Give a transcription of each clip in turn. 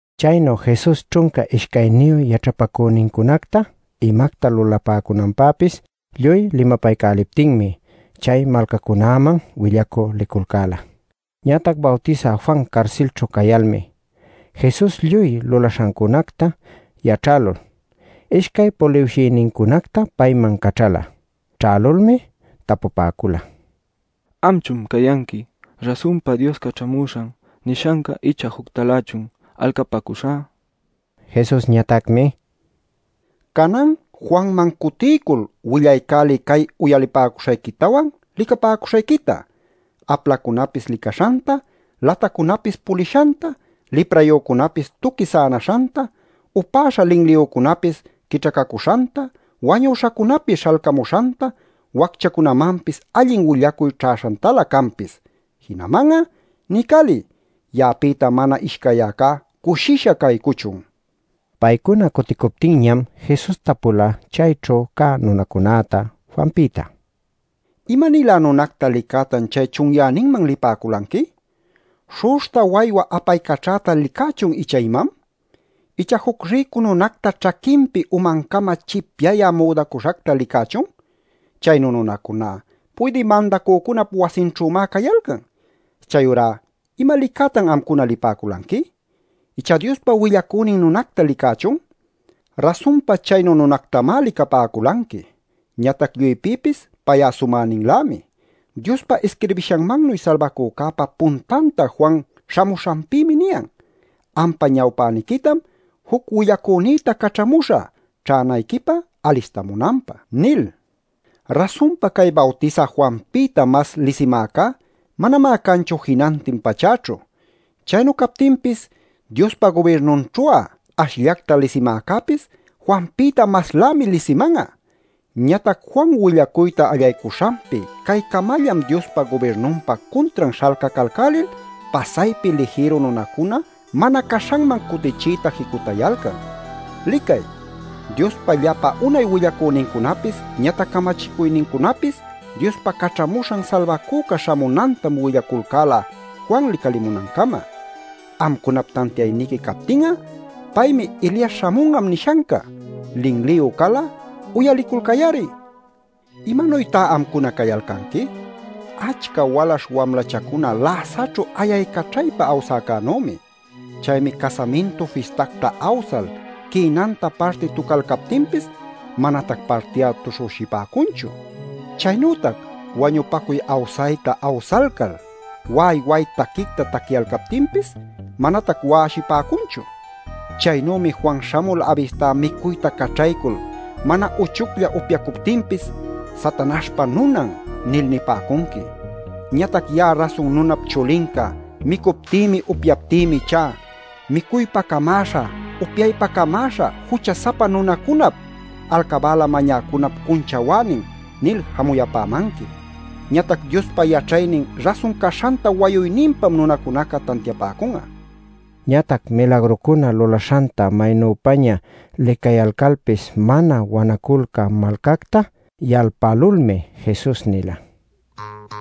Chaynu Jesus ćhunca ishcayniyu yaćhapacünincunacta imacta lulapäcunanpäpis lluy limapaycäliptinmi, chay malcacunäman willacü liculcäla. Ñatac Bawtisä Juan carsilćhu cayalmi Jesus lluy lulaśhancunacta yaćhälul ishcay puliwshïnincunacta payman caćhala. Ćhälulmi tapupäcula: “¿Amchun cayanqui rasunpa Dios Caćhamuśhan nishanca ichá juctalächun alcapäcuśhä?” nil. Jesusñatacmi: “Canan Juanman cutiycul willaycäliy cay uyalipäcuśhayquitawan, licapäcuśhayquita: aplacunapis licaśhanta, latacunapis pulishanta, liprayücunapis tuqui sänaśhanta, upäśha linliyücunapapis quićhacacuśhanta, wañuśhacunapis śhalcamuśhanta, wacchacunämanpis allin willacuy ćhäśhantalä canpis. Jinaman'a niycäliy: ‘Ya'apïta mana ishcayyäcá cushisha caycuchun’” nila. Paycuna cuticuptinñam Jesus tapula chayćhu cä nunacunäta Juanpïta: “¿Ima-nilä nunacta licätan chay chunyäninman lipäculanqui? ¿Śhu'uśhta waywa apaycaćhäta licächun ichá imam? ¿Icha juc rïcu nunacta ćhaquinpi umancama chipyayä müdacuśhacta licächun? Chaynu nunacuná puydï mandacücunap wasinćhümá cayalcan. Chayurá ¿ima licätan amcuna lipäculanqui? ¿Icha Diospa willacünin nunacta licächun? Rasunpa chaynu nunactamá licapäculanqui. Ñatac lluypïpis pay'a sumäninlämi. Diospa isquirbishanmannuy Salbacücäpa puntanta Juan śhamuśhanpïmi niyan: ‘Ampa ñawpäniquitam juc willacünïta caćhamüśhä, ćhänayquipä alistamunanpä’ nil. “Rasunpa cay Bawtisä Juanpïta mas lisimäcá manamá canchu jinantin pachäćhu. Chaynu captinpis Diospa gubirnunćhu'a ashllacta lisimäcäpis Juanpïta maslämi lisiman'a. Ñatac Juan willacuyta allaycuśhanpi caycamallam Diospa gubirnunpa cuntran śhalcacalcälil pasaypi lijïru nunacuna mana caśhanman cutichiyta jicutayalcan. “Licay, Diospa llapa unay willacünincunapis ñatac camachicuycunapis Diospa Caćhamuśhan Salbacüca śhamunantam willaculcäla Juan licalimunancama. Amcunap tantiayniqui captin'a, paymi ‘Elias śhamun'am’ nishanca. Linliyu cal'a, uyaliculcay-ari. “¿Imanuytá amcuna cayalcanqui? Achca walaśh wamlachacuna läsaćhu ayaycaćhaypa awsäcänümi. Chaymi casamintu fistacta awsal quïnanta parti tucalcaptinpis, manatac parti'a tuśhüshipäcunchu. Chaynütac wañupacuy awsayta awsayalcal wa'ay wa'ay taquicta taquiyalcaptinpis manatac wa'awshipäcunchu. Chaynümi Juan śhamul aybistá micuyta caćhaycul mana uchuclla upyacuptinpis, ‘Satanaśhpa nunan’ nil nipäcunqui. Ñatac ya'a Rasun Nunap Chulinca micuptïmi, upyaptïmi ichá, ‘micuypä camäśha, upyaypä camäśha, jucha-sapa nunacunap, alcabäla mañäcunap cunchawänin’ nil jamuyapämanqui. Ñatac Diospa yaćhaynin rasun caśhanta wayuyninpam nunacunaca tantiapäcun'a” nila. Ñatac milagrucuna lulaśhanta maynüpaña licayalcalpis mana wanaculcä malcacta yalpälulmi Jesus nila: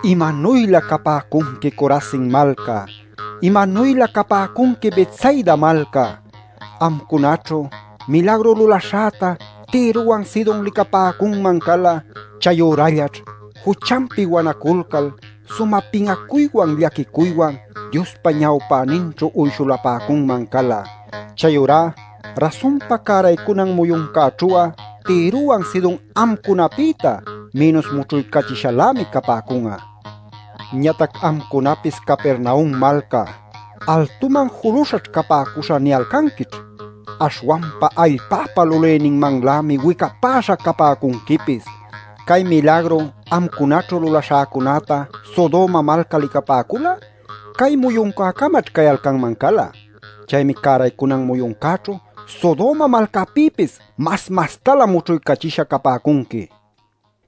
“¡Imanuylä capäcunqui Corazin malca! ¡Imanuylä capäcunqui Betsaida malca! Amcunaćhu milagru lulaśhäta Tirowan Sidon licapäcunman cala. Chayürallaćh juchanpi wanaculcal sumä pin'acuywan llaquicuywan Diospa ñawpäninćhu uyshuläpacunman cala. Chayurá rasunpa cäraycunan muyuncäćhu'a Tirowan Sidon amcunapïta mïnus mućhuycachishalämi capäcun'a. Ñatac amcunapis Capernaum malca ‘Altuman juluśhaćh capäcuśhä’ ¿niyalcanquićh? Aśhwanpa allpäpa lulïninmanlämi wicapäśha capäcunquipis. Cay milagru amcunaćhu lulaśhäcunäta Sodoma malca licapäcul'a, cay muyuncäcamaćh cayalcanman cala. Chaymi cäraycunan muyuncäćhu Sodoma malcapïpis mas mastalä mućhuycachisha capäcunqui” nil.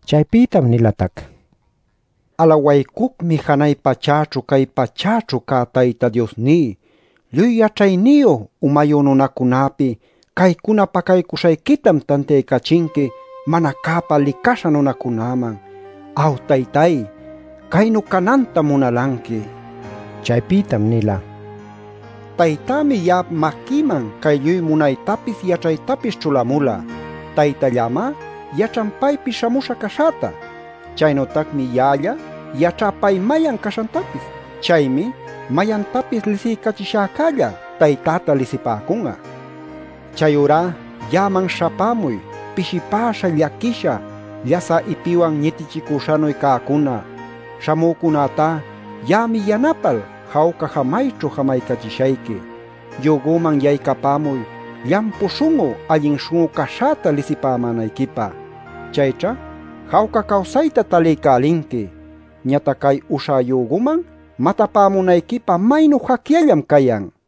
Chaypïtam nilatac: “Alawaycucmi Janay pachäćhu cay pachäćhu cä Tayta Diosní, lluy yaćhayniyu, umayu nunacunäpi caycuna pacaycuśhayquitam tantiaycachinqui mana cäpa licaśha nunacunäman. Aw, Taytay, caynu canantam munalanqui” nil. Chaypïtam nila: “Taytämi ya'ap maquïman cay lluy munaytapis yaćhaytapis ćhulamula. Taytallämá yaćhan paypi śhamüśha caśhäta. Chaynütacmi ya'alla yaćhá pay mayan caśhantapis. Chaymi mayantapis lisiycachishäcälla Taytäta lisipäcun'a. Chayurá ya'aman śhapämuy pishipäśha, llaquisha, llasä ipiwan ñitichicuśhanuy cäcuna. Śhamücunätá ya'ami yanapal, jawca jamayćhu jamachishayqui. Yügüman yaycapämuy llampu śhun'u allin śhun'u caśhäta lisipämänayquipä. Chayćha jawca cawsayta taliycälinqui. Ñatac cay uśhá yügüman matapämunayquipä maynu jacyallam cayan” nil.